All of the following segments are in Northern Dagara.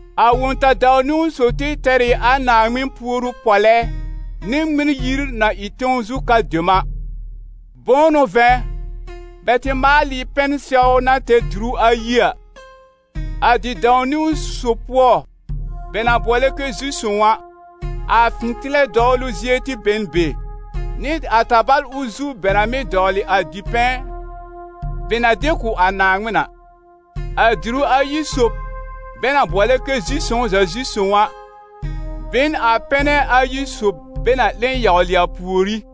A wõ-ta-dãw-niwn sob tɩ tɛr ɩ a Naaŋmɩn puoru pɔlɛ nɩ Ŋmɩn-yir na ɩ tẽw zu ka dem a. Bʋ̃ʋ n'ʋ vɛ̃, bɛ tɩ maal ɩ pɛn-sɛw na tɛr diru ayi a. A di-dãw-niwn sob pʋɔ, bɛ na bʋɔlɛ kɛ zi-sõw a, a fɩ̃tɩlɛ dɔwlʋ zie tɩ be n be, nɩ a tabal ʋl zu bɛ na mɩ́ dɔwlɩ a dipɛ̃ bɛ na de kʋ̀ a Naaŋmɩn a. A diru ayi sob, bɛ na bʋɔlɛ kɛ zi-sõw-za-zi-sõw a, be n a pɛnɛ ayi sob bɛ na 'le yawlɩ a pùorí;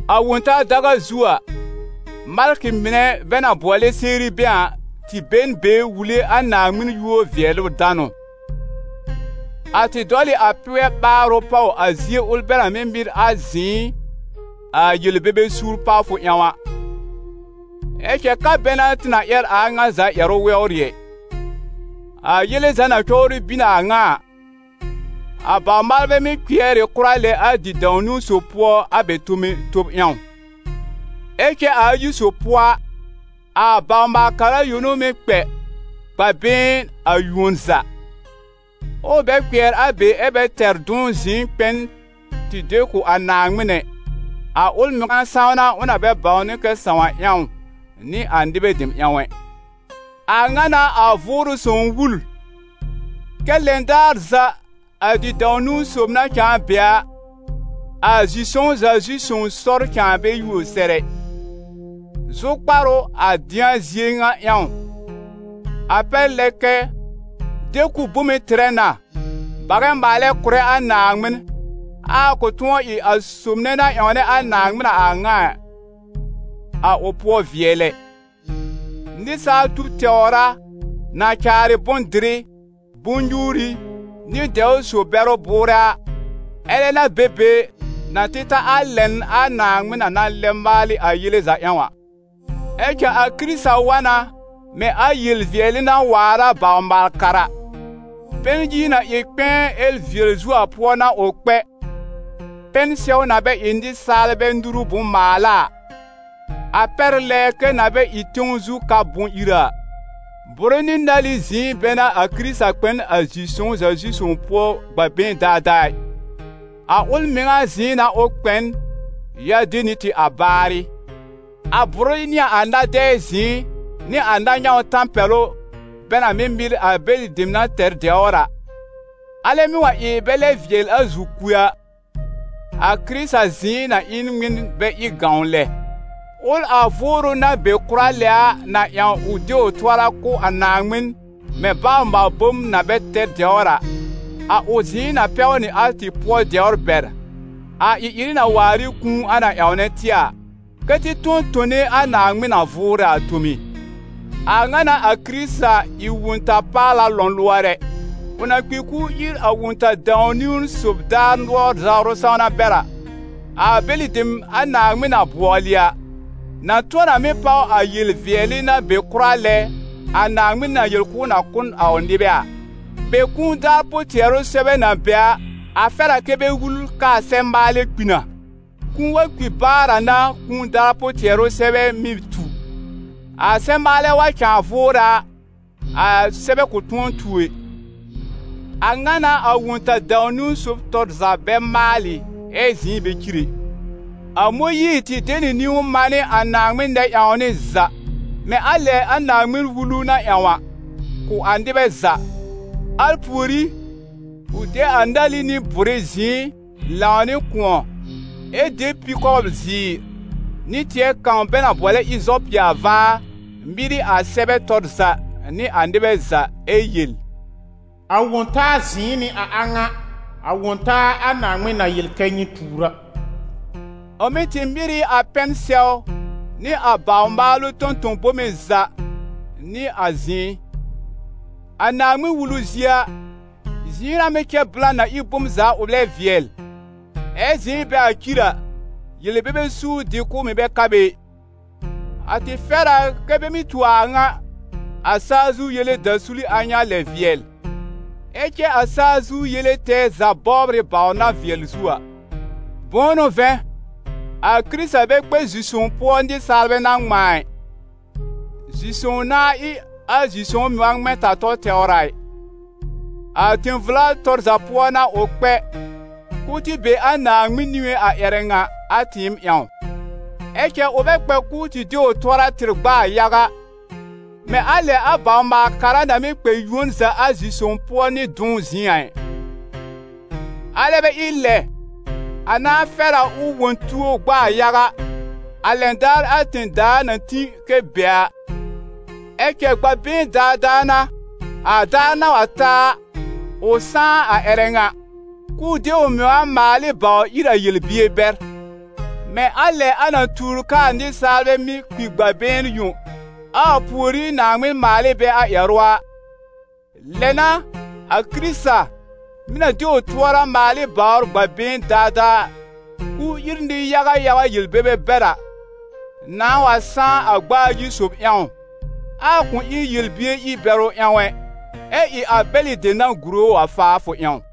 A Wõ-taa daga zu a, malkɩ mɩnɛ bɛ na bʋɔlɛ Serubɛ̃ a, tɩ be n be wule a Naaŋmɩn yúor-vɩɛlʋ-danʋ; a tɩ dɔl ɩ a pɩgɛ ɓaarʋ pàw a zie ʋl bɛ na mɩ́ mɩr a zɩ̃ɩ a yel-bebe suur pawfʋ ƴãw a. Ɛ cɛ ka bɛ n'a tɩ na ƴɛr a a ŋa za ƴɛrʋ wɛwrɩ ɛ. A yele za na cɔbrɩ bin a a ŋa a, a bawr-maalbɛ mɩ́ kpɩɛr ɩ kʋra lɛ a di-dãw-niwn sob pʋɔ a bɛ tome tob ƴãw. Ɛ cɛ a ayi sob pʋɔ a, a bawr-maal-kara yõ n'ʋ mɩ́ kpɛ, gb'a been a yuon za; ɛ ʋ bɛ kpɩɛr a be ɛ́ bɛ tɛr dʋ̃w zɩ̃ɩ kpɛ n tɩ de kʋ̀ a Naaŋmɩn ɛ, a ʋl mɩŋa sãwna ʋ na bɛ bãwnɩ kɛ sãw a ƴãw, nɩ a nɩbɛ dem ƴãw ɛ. A ŋa n'a a Vʋʋrʋ Sõw wul, kɛ́ lɛn daar za a di-dãw-niwn sob na cãa be a, a zi-sõw-za-zi-sõw sɔr cãa bɛ yuo sɛr ɛ. Zʋkpar ʋ a dɩ̃a zie ŋa ƴãw: a pɛr lɛ kɛ de-kʋb bome tɩrɛ na, bagɛ maalɛ kʋ̀rɛ a Naaŋmɩn, ɛ a kʋ̃ tʋ̃ɔ ɩ a sob nɛ na ƴãwnɛ a Naaŋmɩn a a ŋa a, a ʋ pʋɔ vɩɛl ɛ. Nɩsaalbɛ tub tɛwr a, na caarɩ bʋ̃-dɩrɩ, bʋ̃-nyuuri nɩ dɛwr so-bɛrʋ bʋʋrɛ a, alɛ n'a be be na tɩ ta a lɛn a Naaŋmɩn na na lɛb maalɩ a yele za ƴãw a. Ɛ cɛ a Kɩrɩta wa na mɛ̃ a yel-vɩɛlɩ na waar a bawr-maal-kara. Pɛn-yir na ɩ kpɛ̃ɛ ɛ vɩɛl zuo a pʋɔ n'a ʋ kpɛ, pɛn-sɛw na bɛ ɩ nɩsaalbɛ nuru bʋ̃-maala a, a pɛr lɛ kɛ na bɛ ɩ tẽw zu ka bʋ̃-ira a. Bʋrɩ nɩ nali zɩ̃ɩ bɛ n'a a Kɩrɩta kpɛ n a zi-sõw-za-zi-zõw pʋɔ gb'a been daadaa ɩ, a ʋl mɩŋa zɩ̃ɩ n'a ʋ kpɛ n, ya de nɩ tɩ a baarɩ. A bʋrɩ nɩ a na-dɛɛ zɩ̃ɩ nɩ a na-nyãw tãpɛlʋ, bɛ na mɩ́ mɩr a bɛlɩ dem na tɛr dɛwr a, alɛ mɩ́ wa ɩ bɛ lɛb vɩɛl a zi-kue a, a Kɩrɩta zɩ̃ɩ na ɩ n ŋmɩn bɛ ɩ gãw lɛ? Ʋl a Vʋʋrʋ na be kʋra lɛ a na ƴãw ʋ de ʋ tʋɔra kʋ̀ a Naaŋmɩn mɛ̃ bawr-maal-bom na bɛ tɛr dɛwr a, a ʋ zɩ̃ɩ na pɛw nɩ a tɩ pʋɔ dɛwr bɛr, a ɩ-ɩrɩ na waar ɩ kũu a na ƴãw tɩ a, kɛ́ tɩ tʋ̃ɔ tone a Naaŋmɩn na vʋʋrɛ a tome. A ŋa n'a a Kɩrɩta ɩ Wõ-ta-paala lɔ̃lʋɔrɛ; ʋ na kpi k'ʋʋ ír a wõ-ta-dãw-niwn sob daar nʋɔr zawrʋ sãwna bɛr a, a bɛlɩ dem a Naaŋmɩn na bʋɔlɩ a, na tʋ̃ɔ na mɩ́ páw a yel-vɩɛlɩ na be kʋra lɛ a Naaŋmɩn na yel k'ʋʋ na kʋ̀ n a ʋ nɩbɛ a. Be kũu daar pʋ-tɩɛrʋ sɛbɛ na be a, a fɛr a kɛ́ bɛ wul k'aa sɛb-maalɛ kpi na. Kũu wa kpi baar a n'a kũu daar pʋ-tɩɛrʋ sɛbɛ mɩ́ tu. A sɛb-maalɛ wa cãa vʋʋrɛ a, a sɛbɛ kʋ̃ tʋ̃ɔ tu ɛ. A ŋa n'a a wõ-ta-dãw-niwn sob tɔr za bɛ maalɩ ɛ zɩ̃ɩ bɛ cir ɛ. A Mõyiir tɩ de nɩ niwn manɩ a Naaŋmɩn nɛ-ƴãwnɩ za, mɛ̃ a lɛ a Naaŋmɩn-Wulu na ƴãw a, kʋ̀ a nɩbɛ za. Al pùorí, ʋ de a nali nɩ bʋrɩ zɩ̃ɩ lãw nɩ kʋ̃ɔ, ɛ de pi-kɔbl-zɩɩr nɩ tɩɛ kãw bɛ na bʋɔlɛ ɩzɔpɩ a vaar mɩr ɩ a sɛbɛ tɔr za nɩ a nɩbɛ za, ɛ yel: «A wõ-taa zɩ̃ɩ n'ɩ a a ŋa, a wõ-taa a Naaŋmɩn na yel kɛ́ nyɩ tuur a.» Ʋ mɩ̀ tɩ mɩr ɩ a pɛn-sɛw nɩ a baw-maalʋ tõ-tõ-bome za nɩ a zɩ̃ɩ. A Naaŋmɩn-Wulu zie a, zɩ̃ɩ n'a mɩ́ cɛ blã na ɩ bom za ʋ lɛb vɩɛl, ɛ́ zɩ̃ɩ bɛ wa cir a, yel-bebe suur-dɩ-kʋ̀b mɩ̀ bɛ ka be ɩ. A tɩ fɛr a kɛ bɛ mɩ́ tu a a ŋa, a saa zu yele dasuli a ŋa lɛ vɩɛl; ɛ cɛ a saa zu yele tɛɛ za bɔbr ɩ bawr na vɩɛl zuo a. Bʋ̃ʋ n'ʋ vɛ̃, a Kɩrɩta bɛ kpɛ zi-sõw pʋɔ nɩsaalbɛ na ŋmãa ɩ, zi-sõw nãá ɩ a zi-sõw mɩŋa ŋmɛ̃-ta-tɔ tɛwr a ɩ. A tẽ-vla tɔr za pʋɔ n'a ʋ kpɛ, k'ʋʋ tɩ be a Naaŋmɩn niŋé a ƴɛrɛ ŋa a tɩɩm ƴãw. Ɛ cɛ ʋ bɛ kpɛ k'ʋʋ tɩ de ʋ tʋɔra tɩr gb'aa yaga, mɛ̃ a lɛ a bawr-maal-kara na mɩ́ kpɛ yuon za a zi-sõw pʋɔ nɩ dʋ̃w zɩ̃ɩ a ɩ. Alɛ bɛ ɩ lɛ, a nãá fɛr a ʋ wõ tuo gb'aa yaga, a lɛn daar a tẽ-daa na tĩ kɛ be a. Ɛ cɛ, gb'a been daadaa n'a, a daar na wa ta a, ʋ sãá a ƴɛrɛ ŋa, k'ʋʋ de ʋ mɩŋa maal ɩ bawr ír a yel-bier bɛr. Mɛ̃ a lɛ a na tuur k'aa nɩsaalbɛ mɩ́ kpi gb'a been yõ, ɛ a pùorí Naaŋmɩn maal ɩ bɛ a ƴɛrʋ a, lɛ n'a a Kɩrɩta, mɩ̀ na de ʋ tʋɔra maal ɩ bawr gb'a been daadaa k'ʋʋ ír nɩ-yaga yaga yel-bebe bɛr a, nãá wa sãá a gb'a ayi sob ƴãw, ɛ a kʋ̃ ɩ yel-bier ir-bɛrʋ ƴãw ɛ, ɛ ɩ a bɛlɩ dem na gùre ʋ a faafʋ ƴãw.